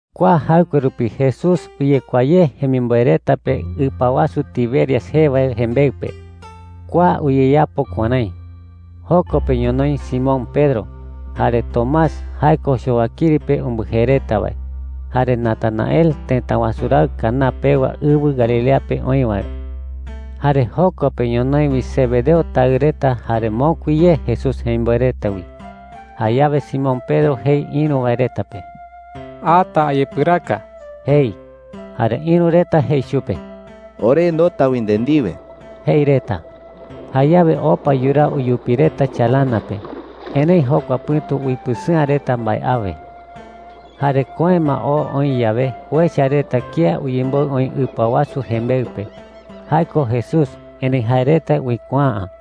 Kua jaɨkue rupi Jesús uyekuaa ye jemimboe reta pe ɨpa wasu Tiberias jee wae jembeɨ pe. Kua uyeyapo kuärái: Joko pe ñonoï Simón Pedro, jare Tomás (jae ko Chowakiri pe umbɨjee reta wae), jare Natanael tëta wasu raɨ Caná pewa ɨwɨ Galilea pe oï wae. Jare joko pe ñonoï wi Zebedeo taɨ reta jare mokui ye Jesús jemimboe reta wi. Jayawe Simón Pedro jei ïru wae reta pe: “Ata ayepɨraka,” jei. Jare ïru reta jei chupe: “Ore ndoota wi nde ndiwe,” jei reta. Jayawe opa yuraa uyupi reta chalana pe. Erëi jokua pɨ̈tu uipɨsɨ'ä reta mbae awe. Jare köe ma oo oï yawe, uecha reta kía uyemboɨ oï ɨpa wasu jembeɨ pe. Jae ko Jesús, erëi jae reta uikuaa’ä.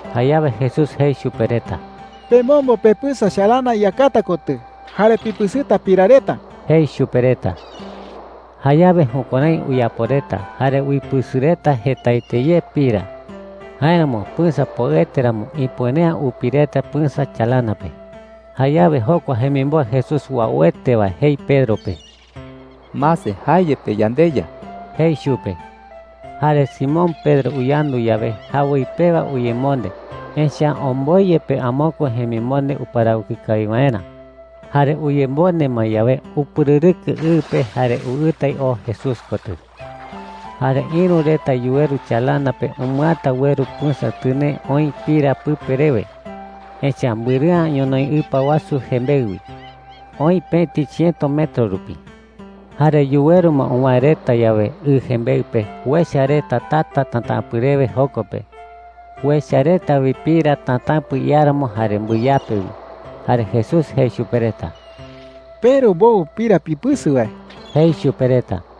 Jayawe Jesús jei chupe reta: “Pemombo pepɨsa chalana iyakata kotɨ jare pipɨsɨta pira reta,” jei chupe reta. Jayawe jukuärái uyapo reta jare uipɨsɨ reta jetaete ye pira. Jáeramo pɨsa poɨete ramo, ipuere’ä upi reta pɨsa chalana pe. Jayawe jokua jemimboe Jesús uauete wae jei Pedro pe: “¡Mase, jae yepe yandeYa!” jei chupe. Jare Simón Pedro uyandu yawe, jawoi pewa uyemonde, echa’ä omboi yepe amokue jemimonde uparawɨkɨ kawi waerä. Jare uyemonde ma yawe, upɨrɨrɨkɨ ɨ pe jare uɨtai oo Jesús kotɨ. Jare ïru reta yuweru chalana pe umɨata ueru pɨsa tɨnee oï pira pɨpe rewe. Echa’ä mbɨrɨ'ä ñonoï ɨpa wasu jembeɨ wi. Oï pëti chiëto metro rupi. Jare yuweru ma uwäe reta yawe ɨ jembeɨ pe, uecha reta tata tatäpɨ rewe joko pe. Uecha reta wi pira tatäpɨ iáramo jare mbɨyape wi. Jare Jesús jei chupe reta: “Peru mbowɨ pira pipɨsɨ wae,” jei chupe reta.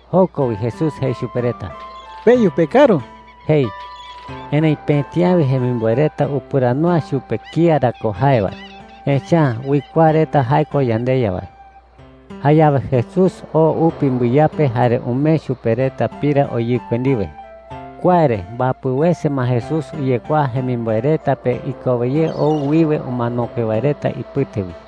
Joko wi Jesús jei chupe reta: “Peyu pekaru,” jei. Erëi pëti awe jemimboe reta upɨrandu’ä chupe kía ra ko jae wae, echa’ä uikuaa reta jae ko yandeYa wae. Jayawe Jesús oo upi mbɨyape jare umee chupe reta pira oyɨkue ndiwe. Kua re mbapɨ wese ma Jesús uyekuaa jemimboe reta pe ikowe ye ou wiwe umanokue wae reta ipɨte wi.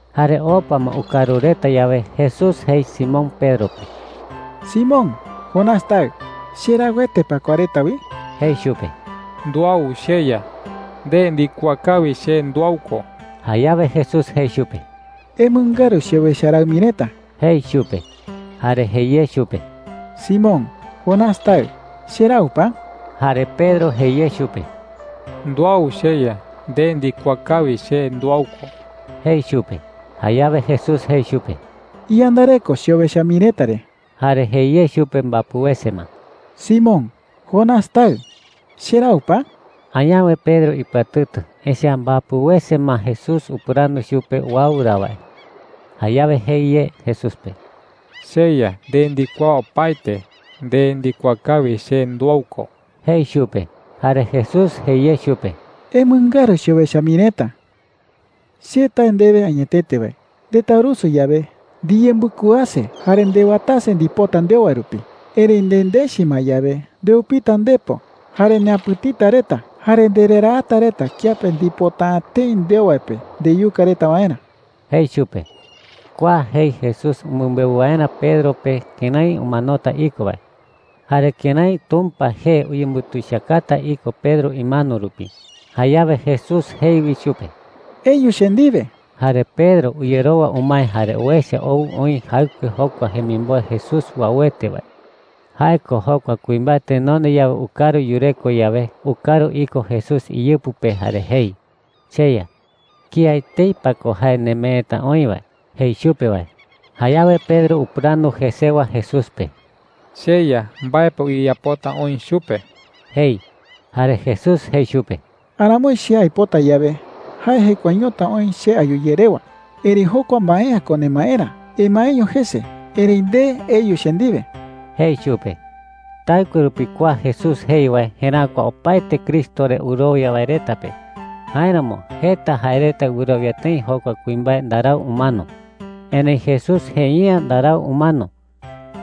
Jare opa ma ukaru reta yawe, Jesús jei Simón Pedro pe: “Simón, Jonás taɨ, ¿cherauete pa kua reta wi?” jei chupe. “Nduau, cheYa,” jei chupe. “Nde ndikuaa kawi che nduau ko.” Jayawe Jesús jei chupe: “Emɨngaru cheowecha raɨ mii reta,” jei chupe. Jare jei ye chupe: “Simón, Jonás taɨ, ¿cherau pa?” Jare Pedro jei ye chupe: “Nduau, cheYa. Nde ndikuaa kawi che nduau ko,” jei chupe. Jayawe Jesús jei chupe: “Iyandareko cheowecha mii reta re.” Jare jei ye chupe mbapɨ wese ma: “Simón, Jonás taɨ, ¿cherau pa?” Añawe Pedro ipɨatɨtɨ, echa’ä mbapɨ wese ma Jesús upɨrandu chupe uau ra wae. Jayawe jei ye Jesús pe: “CheYa, nde ndikuaa opaete. Nde ndikuaa kawi che nduau ko,” jei chupe. Jare Jesús jei ye chupe: “Emɨngaru cheowecha mii reta,” jei chupe. “Che tae ndewe añetete wae, ndetaurusu yawe, ndiyembɨkuaase jare ndewatase ndipota ndeo wae rupi. Erëi nendechi ma yawe, ndeupita ndepo, jare neapɨ̈tita reta jare ndereraata reta kiape ndipota’ä tëi ndeo wae pe ndeyuka reta waerä,” jei chupe. Kua jei Jesús umɨmbeu waerä Pedro pe kërái umanota iko wae jare kërái Tumpa jee uyembutuichakata iko Pedro imano rupi. Jayawe Jesús jei wi chupe: “Eyu che ndiwe.” Jare Pedro uyerowa umae jare uecha ou oï jaɨkue jokua jemimboe Jesús uauete wae. Jae ko jokua kuimbae tenonde yawe ukaru yureko yawe, ukaru iko Jesús iyɨpɨ pe jare jei, “CheYa, ¿kía etei pa ko jae nemeeta oï wae?” jei chupe wae. Jayawe Pedro upɨrandu jesewa Jesús pe: “CheYa, ¿mbae pa uyeyapota oï chupe?” jei. Jare Jesús jei chupe: “Aramoi che aipota yawe, jae jekuaeñota oï che ayu ye rewa. Erëi jokua mbae’ä ko nemaerä. Emaeño jese. Erëi nde, eyu che ndiwe,” jei chupe. Taɨkue rupi kua Jesús jei wae jeräkua opaete Cristo re wɨrowia wae reta pe. Jáeramo jeta jae reta wɨrowia tëi jokua kuimbae ndarau umano. Erëi Jesús jei’ä ndarau umano.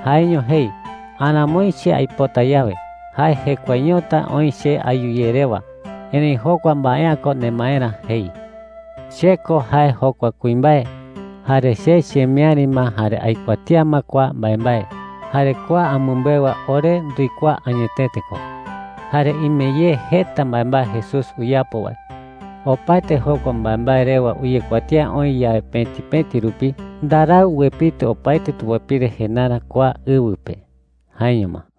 Jaeño jei: “Aramoi che aipota yawe, jae jekuaeñota oï che ayu ye rewa. Erëi jokua mbae’ä ko nemaerä,” jei. Che ko jae jokua kuimbae. Jare che chemiäri ma jare aikuatía ma kua mbaembae. Jare kua amɨmbeu wae ore nduikuaa añetete ko. Jare ime ye jeta mbaembae Jesús uyapo wae. Opaete jokua mbaembae rewa uyekuatía oï yawe pëti pëti rupi, ndarau uepitɨ opaete tupapire jendarä kua ɨwɨ pe. Jaeño ma.